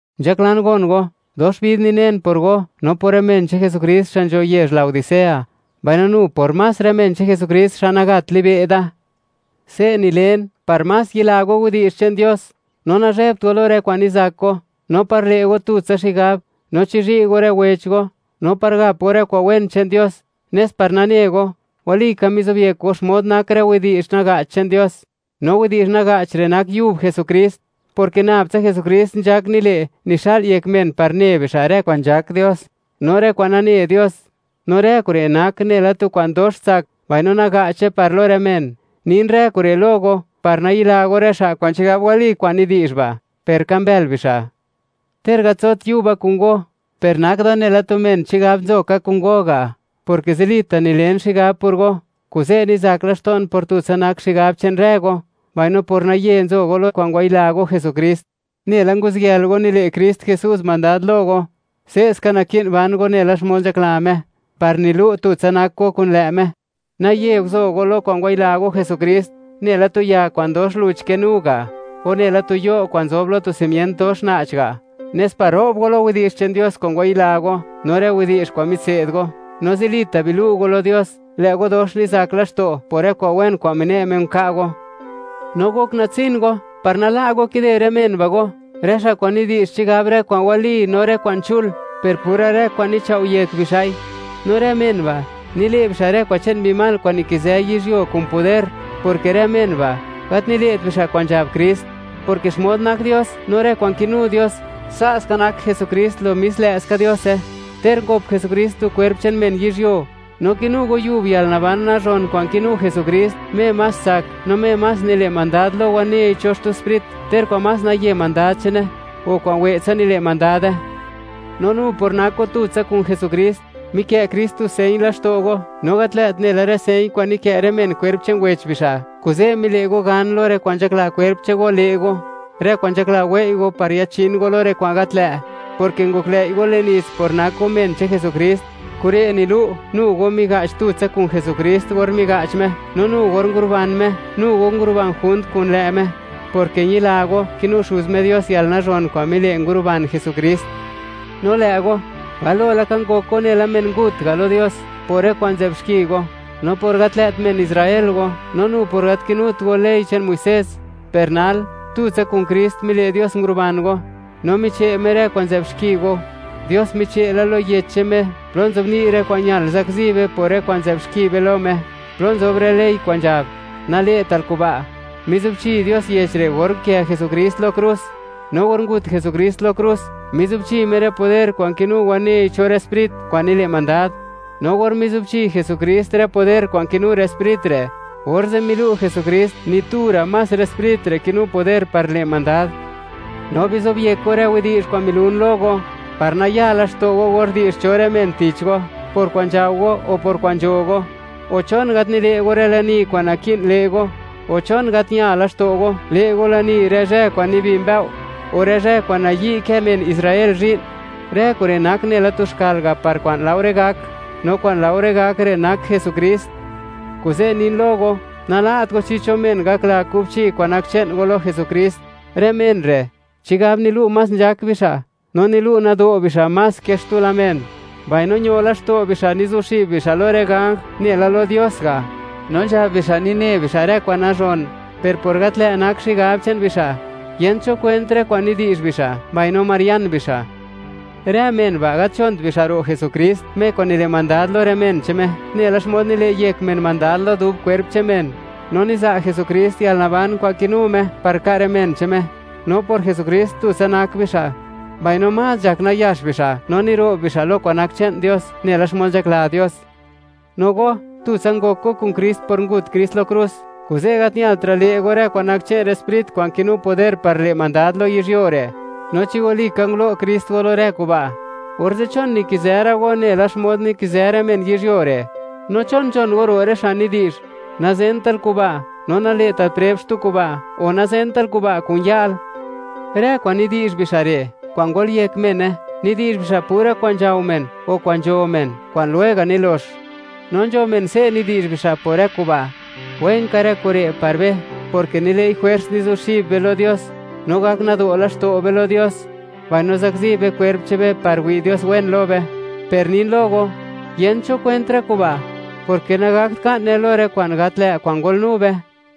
Nzhaklan gon go, dox bid ninen por go no por rë men che'n Jesukrist xa' nzho yezh Laodicea, mbaino nu por más rë men che'n Jesukrist xa' nagat libe' da. Se' nilen par más yila go widi'zh che'n Dios, no nazhebt go lo rë kwa'n nizak go, no par le' go tutsa xigab, no chizhi' go rë wech go, no par gap go rë kwa'n wen che'n Dios, nes par nane go, walika mizobyek go xmod nak rë widi'zh naga'ch che'n Dios, no widi'zh naga'ch re' nak yub Jesukrist, porke nab tsa Jesukrist nzhak nile' nixa'l yek men par ne bixa' rë kwa'n nzhak Dios no rë kwa'n nane Dios; no rë kure' nak nela tu kwa'n dox tsak mbaino naga'che par lo rë men. Nin rë kure' lo go par nayila go rë xa' kwa'n chigab wali kwa'n nidi'zh ba', per ka mbël bixa'. Ter gat nzot yuba kun go, per nak da nela tu men chigab nzo ka kun go ga', porke zilita' nilen xigab por go, kuze' nizak laxto'n por tutsa nak xigab che'n rë go, mbaino por naye nzo go lo kwa'n ngwayila go Jesukrist. Nela nguziyël go, nile' Krist Jesús mandad lo go, se'ska naki'n ban go nela xmod nzhakla Me, par nilu' tutsa nak go kun lë' Me. Naye guzo go lo kwa'n ngwayila go Jesukrist, nela tu ya kwa'n dox luch kinu ga', o nela tu yo' kwa'n nzob lo tu simient dox na'ch ga'; nes par ro'b go lo widi'zh che'n Dios kwa'n ngwayila go no rë widi'zh kwa'n mitse'd go. No zilita' bilu' go lo Dios, lë' go dox nizak laxto' por rë kwa'n wen kwa'n mine' Me nka' go. No gok natsin go par nala' go kide rë men ba' go, rë xa' kwa'n nidi'zh chigab rë kwa'n wali no rë kwa'n chul, per pura rë kwa'n nichao' yek bixa'i. No rë men ba', nile' bixa' rë kwa'n che'n mbi mal kwa'n nikizë yizhyuo kun poder, porke rë men ba', gat nile't bixa' kwa'n nzhab Krist, porke xmod nak Dios, no rë kwa'n kinu Dios, sa' ska nak Jesukrist lo mis lë'ska Diose, ter ngop Jesukrist tu kwerp che'n men yizhyuo, no kinu go yub yalnaban kwa'n nazhon che'n Jesukrist, Me más tsak, no Me más nile' mandad lo wanei cho xtu sprit, ter kwa'n más naye mandad che'ne, o kwa'n we'tsa nile' mandade. No nu por nak go tutsa kun Jesukrist, mikë' Krist tu señ laxto' go, no gat lë't nela rë señ kwa'n nikë' rë men kwerp che'n wech bixa'. Kuze', mile' go gan lo rë kwa'n nzhakla kwerp che'n go, le' go, rë kwa'n nzhakla wei' go par yachin go lo rë kwa'n gat lë', porke ngoklëi' go le'n nits por nak go men che'n Jesukrist, kure' nilu'; nu go miga'ch tutsa kun Jesukrist or miga'ch Me; no nu or nguruban Me, nu go nguruban junt kun lë' Me; porke ñila go, kinu Xuz Me Dios yalnazhon kwa'n mile', nguruban Jesukrist. No lë' go, galo laka ngok go nela men ngut ga' lo Dios por rë kwa'n nzë'b xki go, no por gat lë't men Israel go, no nu por gat kinut go ley che'n Muisés. Per nal, tutsa kun Krist, mile' Dios nguruban go, no miche' Me rë kwa'n nzë'b xki go. Dios miche' la lo yech che'n Me plo nzobni' rë kwa'n ñal zakzi be por rë kwa'n nzë'b xki be lo Me, plo nzob rë ley kwa'n nzhab: “Nale'tal kuba'.” Mizubchi Dios yech re' or nkë' Jesukrist lo krus. No or ngut Jesukrist lo krus, mizubchi Me rë poder kwa'n kinu wanei cho rë sprit kwa'n nile' mandad. No or mizubchi Jesukrist rë poder kwa'n kinu rë sprit re', orze' milu' Jesukrist, ni tu ra' más rë sprit re' kinu poder par le' mandad. No bizob yek go rë widi'zh kwa'n milun lo go, par nayaa laxto' go or di'zh cho rë men tich go, por kwa'n nzhao go o por kwa'n nzho go, o, ¿chon gat nile' go rë lani kwa'n naki'n le' go?, o, ¿chon gat ña laxto' go, le' go lani rë zhë kwa'n nibi mbëo', o rë zhë kwa'n nayi' kë men Israel zhi'n? Rë kure' nak nela tu xkal ga' par kwa'n laore gak, no kwa'n laore gak re' nak Jesukrist. Kuze' nin lo go, nala't go chi cho men gakla kubchi kwa'n nak che'n go lo Jesukrist. Rë men re', chigab nilu' más nzhak bixa', no nilu' nado' bixa' más ke xtu men; mbaino ño laxto' bixa', nizuxib bixa' lo rë ganj, nela lo Dios ga'. No nzhab bixa', nine bixa' rë kwa'n nazhon. Per por gat lë' nak xigab che'n bixa', yent cho kwent rë kwa'n nidi'zh bixa', mbaino marian bixa'. Rë men ba', gat nzhont bixa' ro' Jesukrist, Me kwa'n nile' mandad lo rë men che'n Me, nela xmod nile' yek men mandad lo dub kwerp che'n men; no niza' Jesukrist yalnaban kwa'n kinu Me, par ka' rë men che'n Me, no por Jesukrist, tutsa nak bixa', mbaino más nzhak nayax bixa' no niro'b bixa' lo kwa'n nak che'n Dios, nela xmod nzhakla Dios. No go, tutsa ngok go kun Krist por ngut Krist lo krus, kuze' gat ñaltra' le' go rë kwa'n nak che'n rë sprit kwa'n kinu poder par le' mandad lo yizhyuo re'. No chi walika ngulo' Krist go lo rë kuba', orze', ¿chon nikizë ra' go, nela xmod nikizë rë men yizhyuo re'? No, ¿chon nzhon go ro' rë xa' nidi'zh: “Nazental kuba', no nale'tal preb xtu kuba', o nazental kuba' kun ya'l”? Rë kwa'n nidi'zh bixa' re', kwa'n nzë yek bixa'i, nidi'zh bixa' pura kwa'n nzhao men o kwa'n nzho men, kwa'n lwega' nilox. No nzho men se' nidi'zh bixa' por rë kuba': “Wenka rë kure' par be, porke nile'i jwers, nizuxib be lo Dios, no gak nado' laxto' be lo Dios, mbaino zakzi be kwerp che'n be par wi' Dios wen lo be.” Per nin lo go, yent cho kwent rë kuba', porke nagakt ka'ne lo rë kwa'n gat lë' kwa'n ngolnu be.